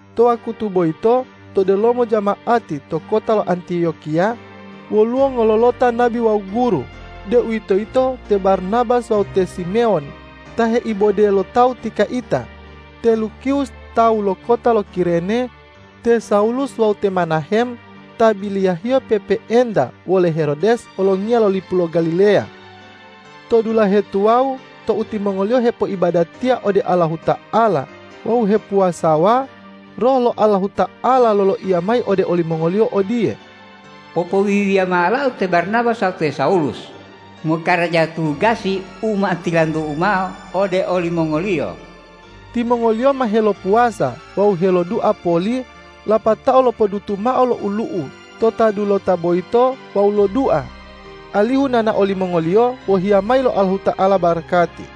To wakutu boyito to delomo jama'ati to kota lo Antiyokiya woluwo ngololota nabi wawu guru, deuwitoyito te Barnabas wawu te Simewon ta heibode lo tawu ti kaita, te Lukiwus tawu lo kota lo Kirene, te Sawulus wawu te Menahem ta biliyahiyo pe'epe'enta wole Herodes olongiya lo lipu lo Galileya. To dulahe tuwawu tou timongoliyo hepoibadatiya ode Allahuta'ala wawu hepuwasawa, Roh lo Allahuta'ala loloiya mayi ode olimongoliyo odiye,”Popowiwiya mao ola-U te Barnabas wawu te Sawulus mokaraja tugasi u ma tilantu-U mao ode olimongoliyo.” Timongoliyo ma helopuwasa wawu helodua poli lapatao lopodutu mao lo olu'u to ta dulota boyito wawu lodua alihu nonao limongoliyo wohiya mayi lo Allahuta'ala barakati.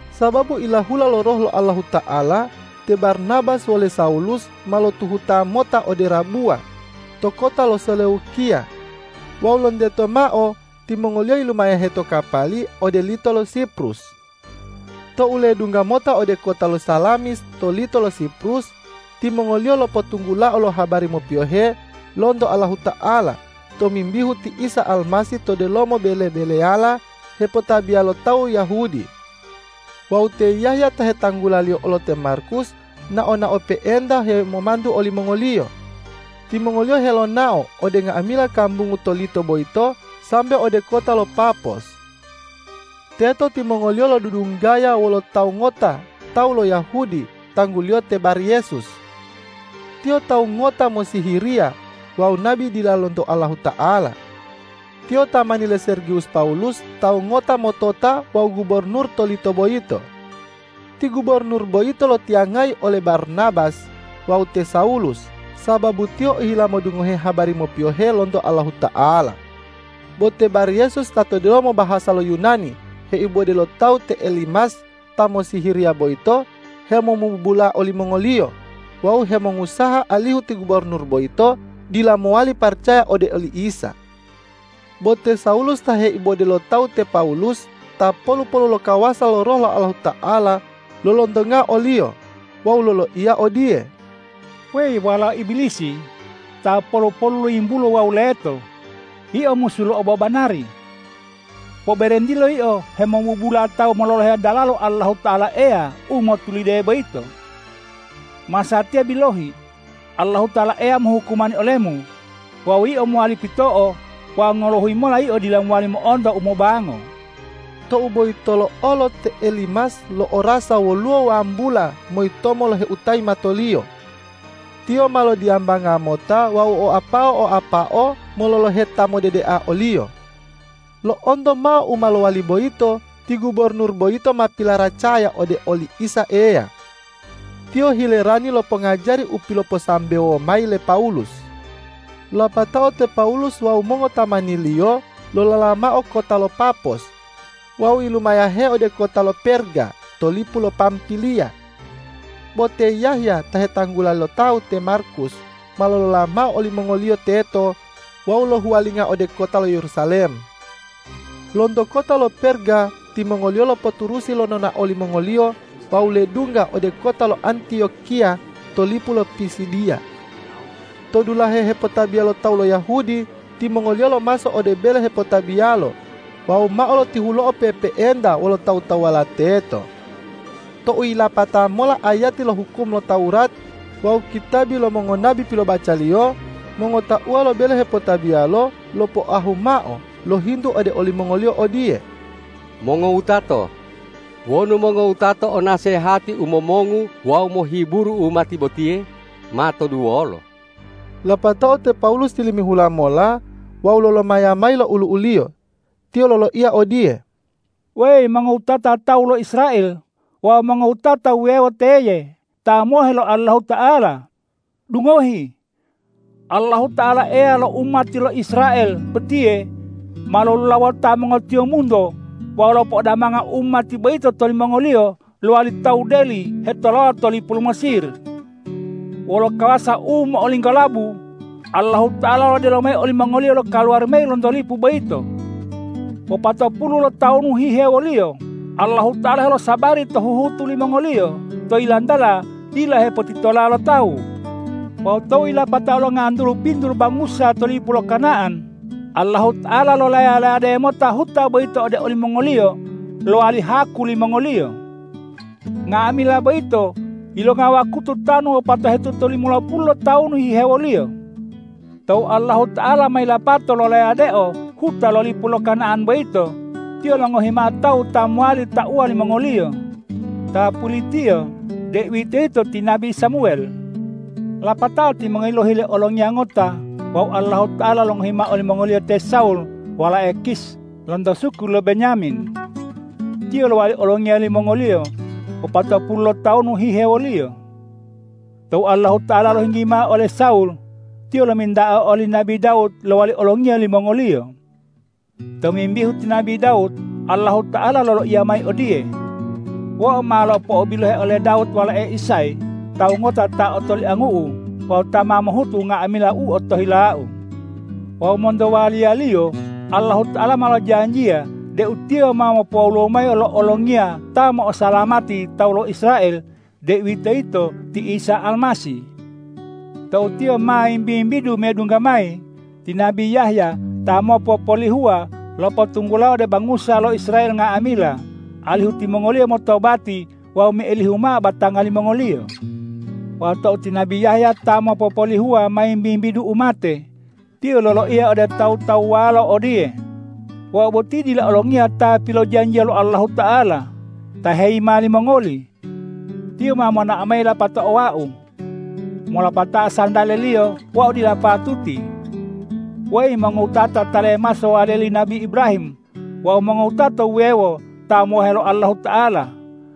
Sababu ilahula lo Roh lo Allahuta'ala, te Barnabas wole Sawulus ma lotuhuta mota ode rabuwa to kota lo Seleukiya wawu lonteto mao timongoliyo yilumayahe to kapali ode lito lo Siprus. Tou ledungga mota ode kota lo Salamis to lito lo Siprus, timongoliyo lopotunggulao lo habari mopiyohe lonto Allahuta'ala tomimbihu ti Isa Almasih to delomo bele-beleyala hepotabiya lo tawu Yahudi. Wawu te Yahya ta hetanggulaliyo olo te Markus nao-nao pe'enta hemomantu olimongoliyo. Timongoliyo helonao ode nga'amila kambungu to lito boyito sambe ode kota lo Papos. Teto timongoliyo lodudunggaya wolo tawu ngota tawu lo Yahudi tangguliyo te Baryesus. Tiyo tawu ngota mossihiriya wawu nabi dila lonto Allahuta'ala. Tiyo tamani le Sergiwus Pawulus tawu ngota motota wawu gubornur to lito boyito. Ti gubornur boyito lotiyangayi ole Barnabas wawu te Sawulus, sababu tiyo ohila modungohe habari mopiyohe lonto Allahuta'ala. Bo te Baryesus ta to delomo bahasa lo Yunani heibode lo tawu te Elimas ta mossihiriya boyito hemomubula olimongoliyo wawu hemongusaha alihu ti gubornur boyito dila mowali paracaya ode oli Isa. Bo te Sawulus ta heibode lo tawu te Pawulus ta polu-polu lo kawasa lo Roh lo Allahuta'ala, lolontongao oliyo wawu loloiya odiye,”Weyi walao Ibilisi, ta polu-polu lo yimbulo wawu leto, yio musu lo obobanari! Poberentilo yio hemomubula tawu mololohe dalalo Allahuta'ala Eya u motulide boyito. Masatiya bilohi, Allahuta'ala Eya mohukumani olemu, wawu yio mowali pito'o wawu ngolohuyi mola yio dila mowali mo'onto umobango.” Tou boyitolo olo te Elimas lo'orasa woluwo wambula moyitomo loheutayi matoliyo. Tiyo ma lodiyambanga mota wawu oapao-oapao mololohe ta modedea oliyo. Lo'onto mao u ma lowali boyito, ti gubornur boyito ma pilaracaya ode oli Isa Eya. Tiyo hilerani lo pongajari u piloposambewo mayi le Pawulus. Lapatao te Pawulus wawu mongotamaniliyo lolola mao kota lo Papos wawu yilumayahe ode kota lo Perga to lipu lo Pampiliya. Bo te Yahya ta hetanggula lo tawu te Markus ma lolola mao olimongoliyo teto wawu lohuwalinga ode kota lo Yerusalem. Lonto kota lo Perga timongoliyo lopoturusi lo nonao limongoliyo wawu ledungga ode kota lo Antiyokiya to lipu lo Pisidiya. To dulahe hepotabiya lo tawu lo Yahudi timongoliyo lomaso ode bele hepotabiyalo wawu mao lotihulo'o pe'epe'enta wolo tawu-tawuwala teto. Tou yilapata mola ayati lo hukum lo Tawurat wawu kitabi lo mongonabi pilobacaliyo, mongotauwa lo bele hepotabiyalo lopoahu mao lohintu ode olimongoliyo odiye,”Mongowutato, wonu mongowutato o nasehati u momongu wawu mohiburu umati botiye, matoduwolo!” Lapatao te Pawulus tilimihula mola wawu lolomaya mayi lo olu'uliyo. Tiyo loloiya odiye,”Weyi mongowutata tawu lo Israel wawu mongowutata wuwewo teye ta mohe lo Allahuta'ala, dungohi! Allahuta'ala Eya lo umati lo Israel botiye ma lolulawota mongotiyombunto wawu lopo'odamanga umati boyito tou timongoliyo lowali tawu deli hetolawa to lipu lo Mesir. Wolo kawasa u mo'olinggolabu Allahuta'ala lodelo mayi olimongoliyo lokaluwari mayi lonto lipu boyito. Wopatopulu lotawunu hihewoliyo Allahuta'ala helosabari to huhutu limongoliyo to yilantala dila hepotitola lo tawu. Wawu tou yilapatao longantulu pitu lo bangusa to lipu lo Kana'an, Allahuta'ala lolaya-layade mota huta boyito ode olimongoliyo lowali haku limongoliyo. Nga'amila boyito yilonga wakutu tanu wopatohetuta limolopulu lotawunu hihewoliyo. Tou Allahuta'ala ma yilapato lolayadeo huta lo lipu lo Kana'an boyito, Tiyo longohi mao tawu ta mowali tauwa limongoliyo. Ta pulitiyo, deuwitoyito ti nabi Samuwel. Lapatao timongoliyo lohile olongiya ngota wawu Allahuta'ala longohi mao olimongoliyo te Sawul walae Kish lonto suku lo Benyamin. Tiyo lowali olongiya limongoliyo wopatopulu lotawunu hihewoliyo. Tou Allahuta'ala lohinggi mao ole Sawul, Tiyo lominta'ao oli nabi Dawud lowali olongiya limongoliyo. Tomimbihu ti nabi Dawud Allahuta'ala loloiya mayi odiye, ’Wau ma lopo'obilohe ole Dawud walae Isay, tawu ngota ta otoliangu-U wawu ta ma mohutu nga'amila u otohila-U.’ Wawu monto waliyaliyo Allahuta'ala ma lojanjiya deu Tiyo ma mopowoluwo mayi lo Olongiya ta mo'osalamati tawu lo Israel, deuwitoyito ti Isa Almasih. Tou Tiyo ma wimbi-wimbidu medungga mayi, ti nabi Yahya ta mopopolihuwa lopotunggulao ode bangusa lo Israel nga'amila, alihu timongoliyo motobati wawu meilihu mao batanga limongoliyo. Wawu tou ti nabi Yahya ta mopopolihuwa ma wimbi-wimbidu umate, tiyo loloiya ode tawu-tawuwalo odiye, ’Wau boti dila Olongiya ta pilojanjiya lo Allahuta'ala, ta heyima limongoli. Tiyo ma monao mayi lapatao wau. Molopatao santale-Liyo wau dila patuti.’ Weyi mongowutata ta lemaso waliya li nabi Ibrahim wawu mongowutata wuwewo ta mohe lo Allahuta'ala,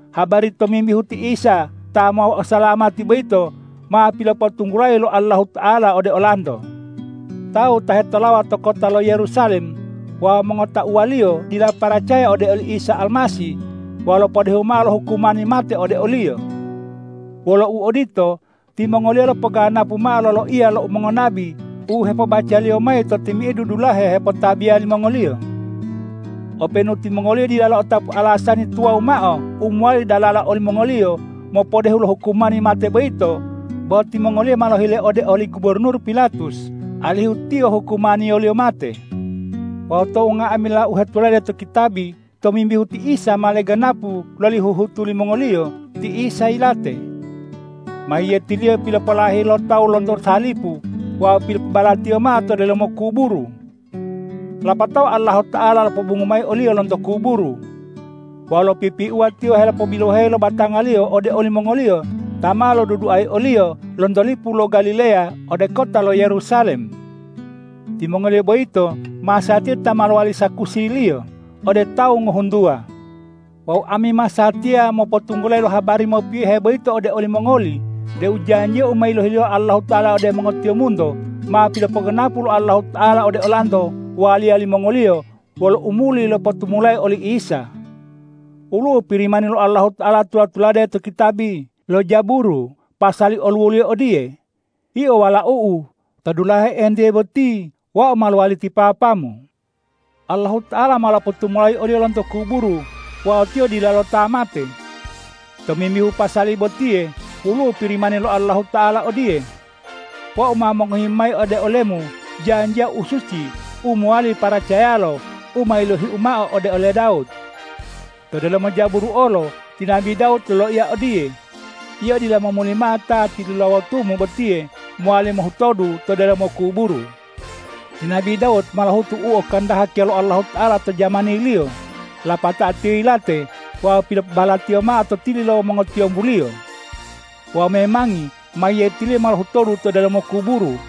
habari tomimbihu ti Isa ta mo'osalamati boyito ma pilopotunggulayi lo Allahuta'ala ode olanto. Tawu ta hetolawa to kota lo Yerusalem wawu mongotauwaliyo dila paracaya ode li Isa Almasih wawu lopodehu mao lo hukumani mate ode o-Liyo. Wolo uodito, timongoliyo lopoganapu mao loloiya lo mongonabi u hepobacaliyo mayi to timi'idu dulahe hepotabiya limongoliyo. Openu timongoliyo dila lo'otapu alasani tuwawu mao u mowali dalala olimongoliyo mopodehu lo hukumani mate boyito, bo timongoliyo ma lohile ode oli gubornur Pilatus alihu Tiyo hukumaniyoliyo mate. Wawu tou nga'amila u hetulade to kitabi tomimbihu ti Isa ma leganapu loli huhutu limongoliyo, ti Isa yilate. Mayiyeti-Liyo pilopolaheyi lo tawu lonto salipu wawu pilopobalatiyo mao to delomo kuburu. Lapatao Allahuta'ala lopobongu mayi o-Liyo lonto kuburu. Wawu lopipiuwa Tiyo helopobiloheyi lo batanga-Liyo ode olimongoliyo ta ma loduduayi o-Liyo lonto lipu lo Galileya ode kota lo Yerusalem. Timongoliyo boyito masatiya ta ma lowali sakusi-Liyo ode tawu ngohuntuwa. Wawu ami masatiya mopotunggulayi lo habari mopiyohe boyito ode olimongoli deu janjiya u ma yilohi lo Allahuta'ala ode mongotiyombunto, ma pilopoganapu lo Allahuta'ala ode olanto waliya limongoliyo, wolo u muli lopotumulayi oli Isa. Woluwo Pirimani lo Allahuta'ala tula-tulade to kitabi lo Jaburu pasali oluwoliyo odiye, ’Yio Walau-U, to dulahe entiye boti Wau ma lowali ti Papa-Mu.’ Allahuta'ala ma lopotumulayi o-Liyo lonto kuburu wawu Tiyo dilalo ta mate. Tomimbihu pasali botiye woluwo Pirimani lo Allahuta'ala odiye, ’Wau ma mongohi mayi ode ole-Mu janjiya u suci u mowali paracayalo, u ma yilohi-U mao ode ole Dawud.’ To delomo Jaburu olo ti nabi Dawud loloiya odiye, ’Yio dila momuli mao Ta tilulawotu-Mu botiye mowali mohutodu to delomo kuburu.’ Ti nabi Dawud ma lohutu u okahandakiya lo Allahuta'ala to jamaniliyo, lapatao tiyo yilate wawu pilopobalatiyo mao to tili lo mongotiyombuliyo. Wawu memangi meyetiliyo ma lohutodu to delomo kuburu.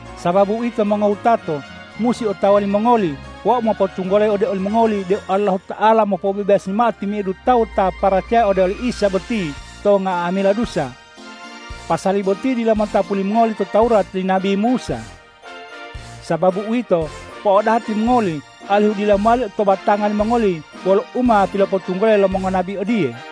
Sababu uwito mongowutato, musi otawa limongoli wau mopotunggulayi ode olimongoli deu Allahuta'ala mopobebasi mao timi'idu tawu ta paracaya ode oli Isa boti to nga'amila dusa. Pasali boti dila motapu limongoli to Tawurat li nabi Musa. Sababu uwito, po'odaha timongoli alihu dila mowali to batanga limongoli wolo u ma pilopotunggulayi lo mongonabi odiye,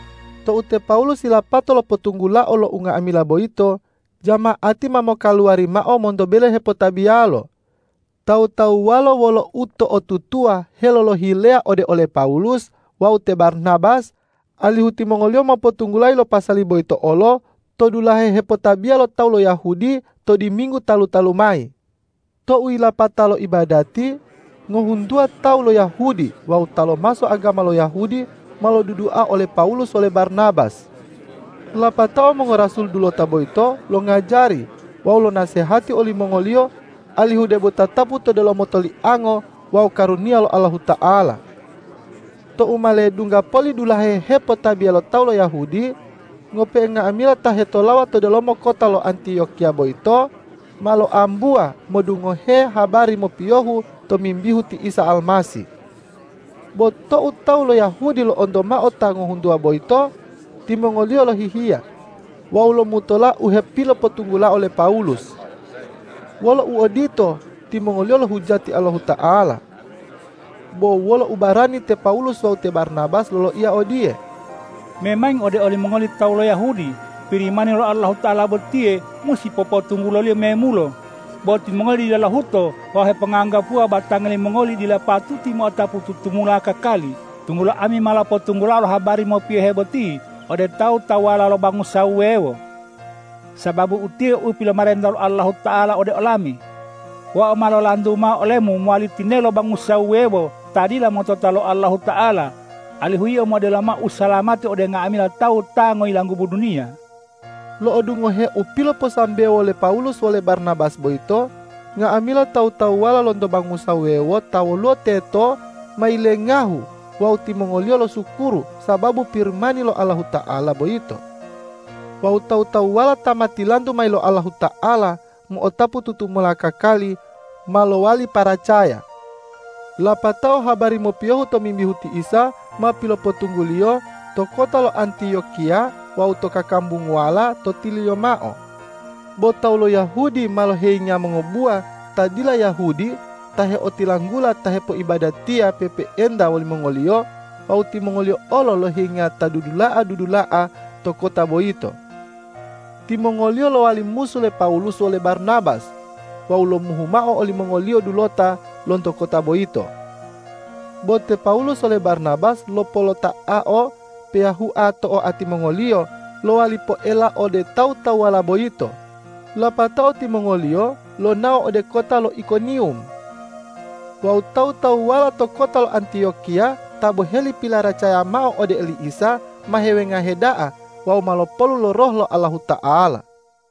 Tou te Pawulus yilapato lopotunggulao lo unga'amila boyito, jama'ati ma mokaluwari mao monto bele hepotabiyalo. Tawu-tawuwalo wolo uto'otutuwa helolohileya ode ole Pawulus wawu te Barnabas, alihu timongoliyo mopotunggulayi lo pasali boyito olo to dulahe hepotabiya lo tawu lo Yahudi to diminggu talu-talu mayi. Tou yilapatao lo ibadati, ngohuntuwa tawu lo Yahudi wawu ta lomaso agama lo Yahudi ma lodudua ole Pawulus wole Barnabas. Lapatao mongorasul dulota boyito longajari wawu lonasehati olimongoliyo alihu debo tatapu to delomo toliango wawu karuniya lo Allahuta'ala. Tou ma ledungga poli dulahe hepotabiya lo tawu lo Yahudi, ngope'e nga'amila ta hetolawa to delomo kota lo Antiyokiya boyito ma loambuwa modungohe habari mopiyohu tomimbihu ti Isa Almasih. Bo tou tawu lo Yahudi lo'onto mao ta ngohuntuwa boyito, timongoliyo lohihiya wawu lomutola u hepilopotunggulao le Pawulus. Wolo uodito, timongoliyo lohujati Allahuta'ala. Bo wolo ubarani te Pawulus wawu te Barnabas loloiya odiye,”Memangi ode olimongoli tawu lo Yahudi, Pirimani lo Allahuta'ala botiye musi popotungguloliyo memulo, bo timongoli dila lohuto wawu heponganggapuwa batanga limongoli dila patuti mo'otapu tutumula kakali, tunggulo ami ma lopotunggulao lo habari mopiyohe boti ode tawu-tawuwala lo bangusa wuwewo. Sababu utiye u pilomarenta lo Allahuta'ala ode olami, ’Wau ma lolantu mao olemu mowali tinelo bangusa wuwewo ta dila motota lo Allahuta'ala, alihu yio modelo mao usalamati ode nga'amila tawu ta ngoyilanggubu duniya.’” Lo'odungohe u piloposambewo le Pawulus wole Barnabas boyito, nga'amila tawu-tawuwala lonto bangusa wuwewo ta woluwo teto ma yilengahu wawu timongoliyo losukuru sababu Pirimani lo Allahuta'ala boyito. Wawu tawu-tawuwala ta ma tilantu mayi lo Allahuta'ala mo'otapu tutumula kakali, ma lowali paracaya. Lapatao habari mopiyohu tomimbihu ti Isa ma pilopotungguliyo to kota lo Antiyokiya wawu to kakambunguwala to tililiyo mao. Bo tawu lo Yahudi ma loheyinga mongobuwa ta dila Yahudi ta heotilanggula ta hepoibadatiya pe'epe'enta wolimongoliyo wawu timongoliyo olo loheyinga ta dudula'a-dudula'a to kota boyito. Timongoliyo lowali musu le Pawulus wole Barnabas wawu lomuhu mao olimongoliyo dulota lonto kota boyito. Bo te Pawulus wole Barnabas lopolota'ao peyahua to oati mongoliyo lowali poela ode tawu-tawuwala boyito, lapatao timongoliyo lonao ode kota lo Ikoniwum. Wawu tawu-tawuwala to kota lo Antiyokiya ta boheli pilaracaya mao ode oli Isa, ma hewengahe da'a wawu ma lopolu lo Roh lo Allahuta'ala.